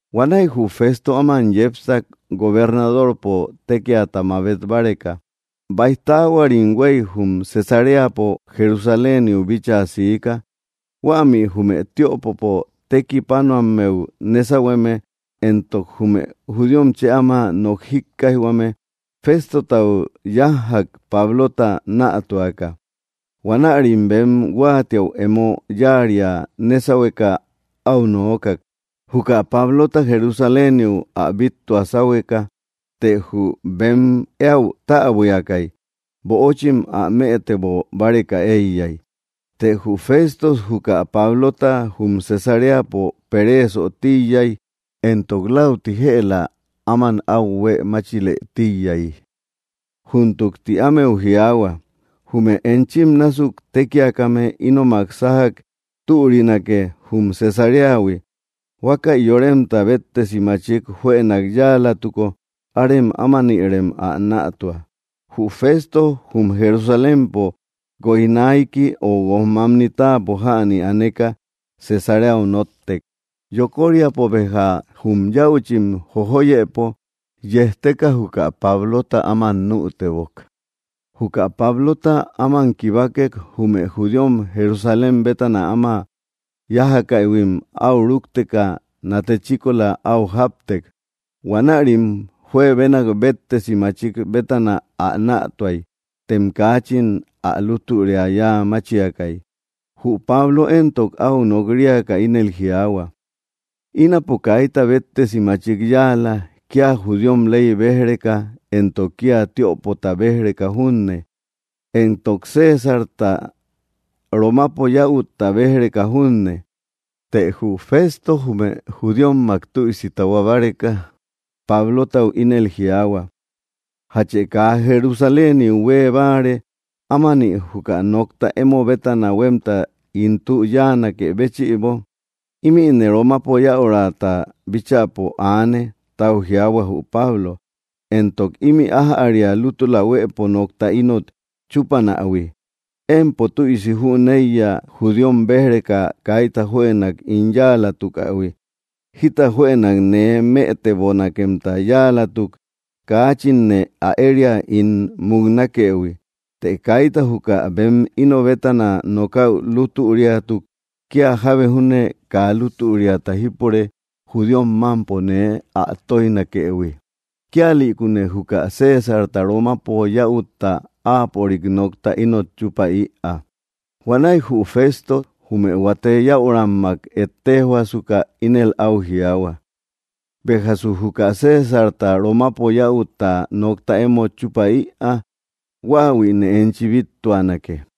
Huanäi jü Fésto áma yépsak gobernadorpo tékiata mabét báreka. Baij taáhuarim huei jum Cesaréapo Jerusaléniu bíchaa siika. Huämi jume tiöpopo tekipánoammeu nésauhueme, éntok jume judíom chë áma nok jíkkaijhuame, Féstotau yájjak Pablota nätuaka. Huanärim bem huáatiäu emo yáaria nésauhueka au noókak, juka Pablota Jerusaléniu ä bittua sáhueka. Të jü bem éäu täbuiakai, böochim ä mëtebo báreka eiyai. Të jü Fésto juka Pablota jum Cesaréapo peréesö tíiyai, éntok läuti jëla áman au huée máchilë tíiyay. —Júntuk —ti ámeu jiaahua— jume enchim násuk tékiakame ínomak sájak türinake jum Cesaréahui. Huákäi yoremta béttesi machik juënak yáalatuko árem ámanirem ä nätua. Jü Fésto jum Jerusalémpo guojnaiki o guojmamni táapo jäni aneka Cesaréau nótek. Yokóriapo béja jum yäuchim jojóyëpo yejteka juka Pablota áman nütebok. Juka Pablota áman kibákek, jume judíom Jerusalén bétana áma yájakaïhuim au rúkteka nate chíkola au jáptek. Huanärim juebénak béttesi machik bétana ä nätuai, tem kaachin ä lútüria yáa máchiakai. Jü Pablo éntok, au nok‑riaka ínel jiaahua: —Ínapo kaita béttesi machik yáala, kia judíom ley béj‑reka éntok kia tiöpota béj‑reka junne, éntok Césarta, Romapo yäutta, béj‑reka junne. Të jü Fésto jume judíommak tüisi tahuá báreka, Pablotau ínel jiaahua: —¿Játchë kaa Jerusaléniu huee báare ámani juka nokta emo bétana huemta ín tü yáanakë béchïbo? —Ímïne Romapo yäurata bíchäpo aane —tau jiaahua jü Pablo—, éntok ímï ájäria lútula huëpo nokta ínot chúpanähui. Empo tüisi jüneiya judíom béj‑reka kaita juënak ín yáalatukähui. Jita juënak nee mëtebonakemta yáalatuk kaáchinne ä eria ín muknákëhui. Të kaita juka bem íno bétana nokäu lútüriatuk, kia jábe júne kaa lútüriata jípure judíom mampo nee ä tóijnakëhui. Kíalïkune juka Césarta, Romapo yäutta, áapörik nokta ínot chupäïa. Huanäi jü Fésto jume huate yäurammak ettéjhuasuka ínel au jiaahua: —Béjasë juka Césarta, Romapo yäutta, nokta émot chupäïa, huáahuïne enchi bíttuanake.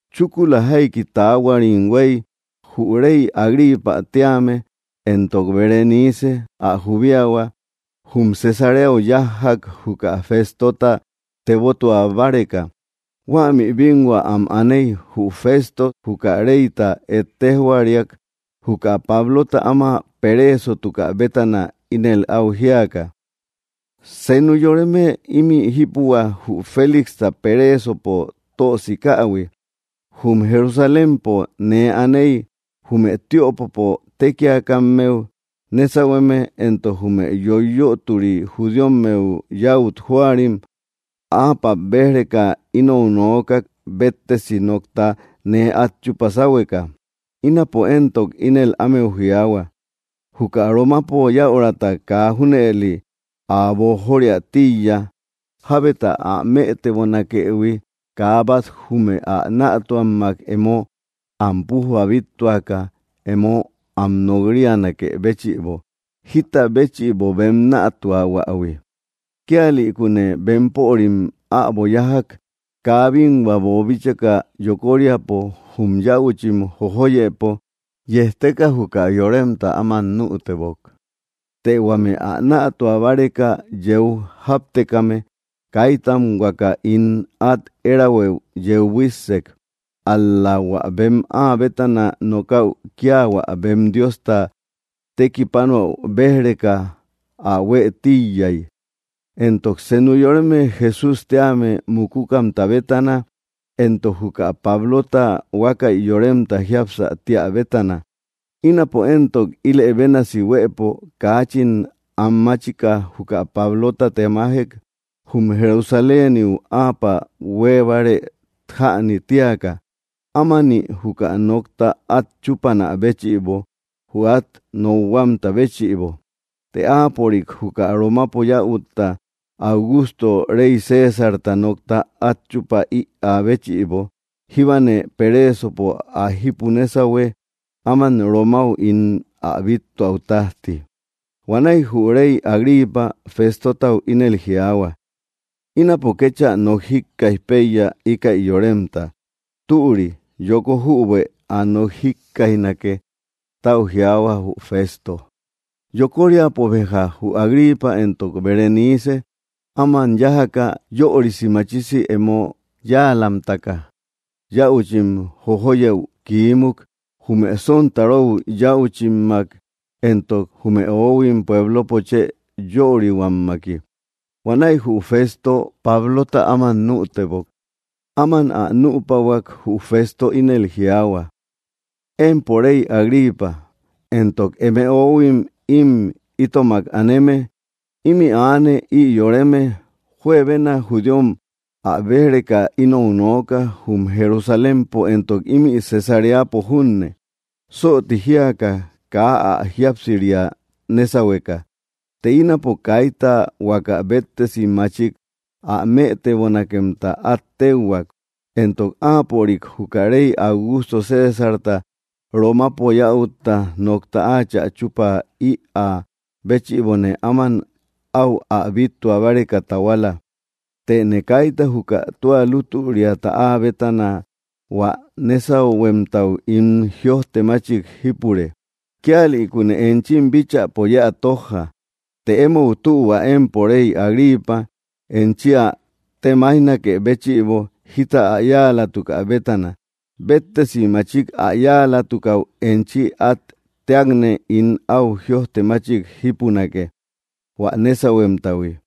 Chúkula jaiki taáhuarim huei, jü rey Agripa téame éntok Berenice ä jubíahua jum Cesaréau yájjak juka Féstota tebótua báreka. Huämi binhua am anéi, jü Fésto juka reyta ettéjhuariak juka Pablota áma peréesotukä bétana ínel au jíaka: —Senu yoreme imï jípuhua jü Félixta peréesopo tösikähui. Jum Jerusalémpo nee anéi, jume tiöpopo tékiakammeu nésauhueme éntok jume yoiyötori judíommeu yäut jóarim apä béj‑reka inou noókak béttesi nokta nee at chupa sáhueka. Ínapo éntok, ínel ámeu jiaahua, juka Romapo yäuraata kaa junëli ä boojóriä tíiya, jábeta ä mëtebonakëhui kaa bat jume ä nätuammak emo am pújba bíttuaka emo am nok‑rianakë béchïbo, jita béchïbo bem nätuahuähui. Kíalïkune bempörim äbo yájak, kaa binhua boobíchaka yokóriapo jum yäuchim jojóyëpo yejteka juka yoremta áman nütebok. Të huame ä nätua báreka yeu jáptekame kaítam huaka ín at érahuëu yeu buíssek. Ál‑la hua bem áa bétana nokäu kia hua bem Diosta tekipánäu béj‑reka ä huë tíiyai, éntok senu yoreme Jesús téame mukúkamta bétana, éntok juka Pablota huákäi yoremta jiapsä tíä bétana. Ínapo éntok, ílë bénasi huëpo kaachin anmáchika juka Pablota temájek jum Jerusaléniu áapörik hueebare jänï tíaka, ámani juka nokta at chúpanä béchïbo jü at nokhuamta béchïbo. Të áapörik juka Romapo yäutta, Augusto rey Césarta, nokta at chupä ïä béchïbo, jíbane peréesopo ä jipu nésauhue áman Romáu ín ä bíttuäu tajti. Huanäi jü rey Agripa Féstotau ínel jiaahua: —Ínapo kéchä nok jíkkaij peiya íkäi yoremta. —Türi, yoko jübuë ä nok jíkkaijnake —tau jiaahua jü Fésto. Yokoríapo béja jü Agripa éntok Berenice áman yájaka, yörisi machisi emo yáalamtaka yäuchim jojóyëu kiímuk jume sontaróu yäuchimmak éntok jume oóhuim puéblopo chë yörihuammaki. Huanäi jü Fésto Pablota áman nütebok. Ama ä nüpahuak, jü Fésto ínel jiaahua: —Empo rey Agripa, éntok eme oóhuim im itomak aneme, imi aane ï yoreme. Juebena judíom ä béj‑reka inou nooka jum Jerusalémpo éntok ímï Cesaréapo junne, sootí jíaka kaa ä jíapsiria nésauhueka. Të ínapo kaita huaka béttesi machik ä mëtebonakemta at téuhuak, éntok áapörik juka rey Augusto Césarta, Romapo yäutta, nokta áachä chupä ïä béchïbone áman au ä bíttua báreka tahuala. Tëne kaita juka tua lútüriata áa bétana hua nésauhuemtau ín jïojtemachik jípure. Kíalïkune enchim bíchäpo yéä tójja, të emou tühua, empo rey Agripa, enchi ä temaijnakë béchïbo jita ä yáalatukä bétana. Béttesi machik ä yáalatukäu enchi at téakne ín au jïojte machik jípunake, hua nésahuemtahui.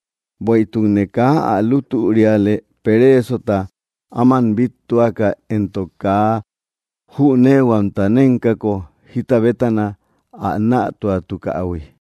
Bueïtukne kaa ä lútüriale pereesota áman bíttuaka éntok, kaa jüneehuamta nénkako jita bétana ä nätuatukähui.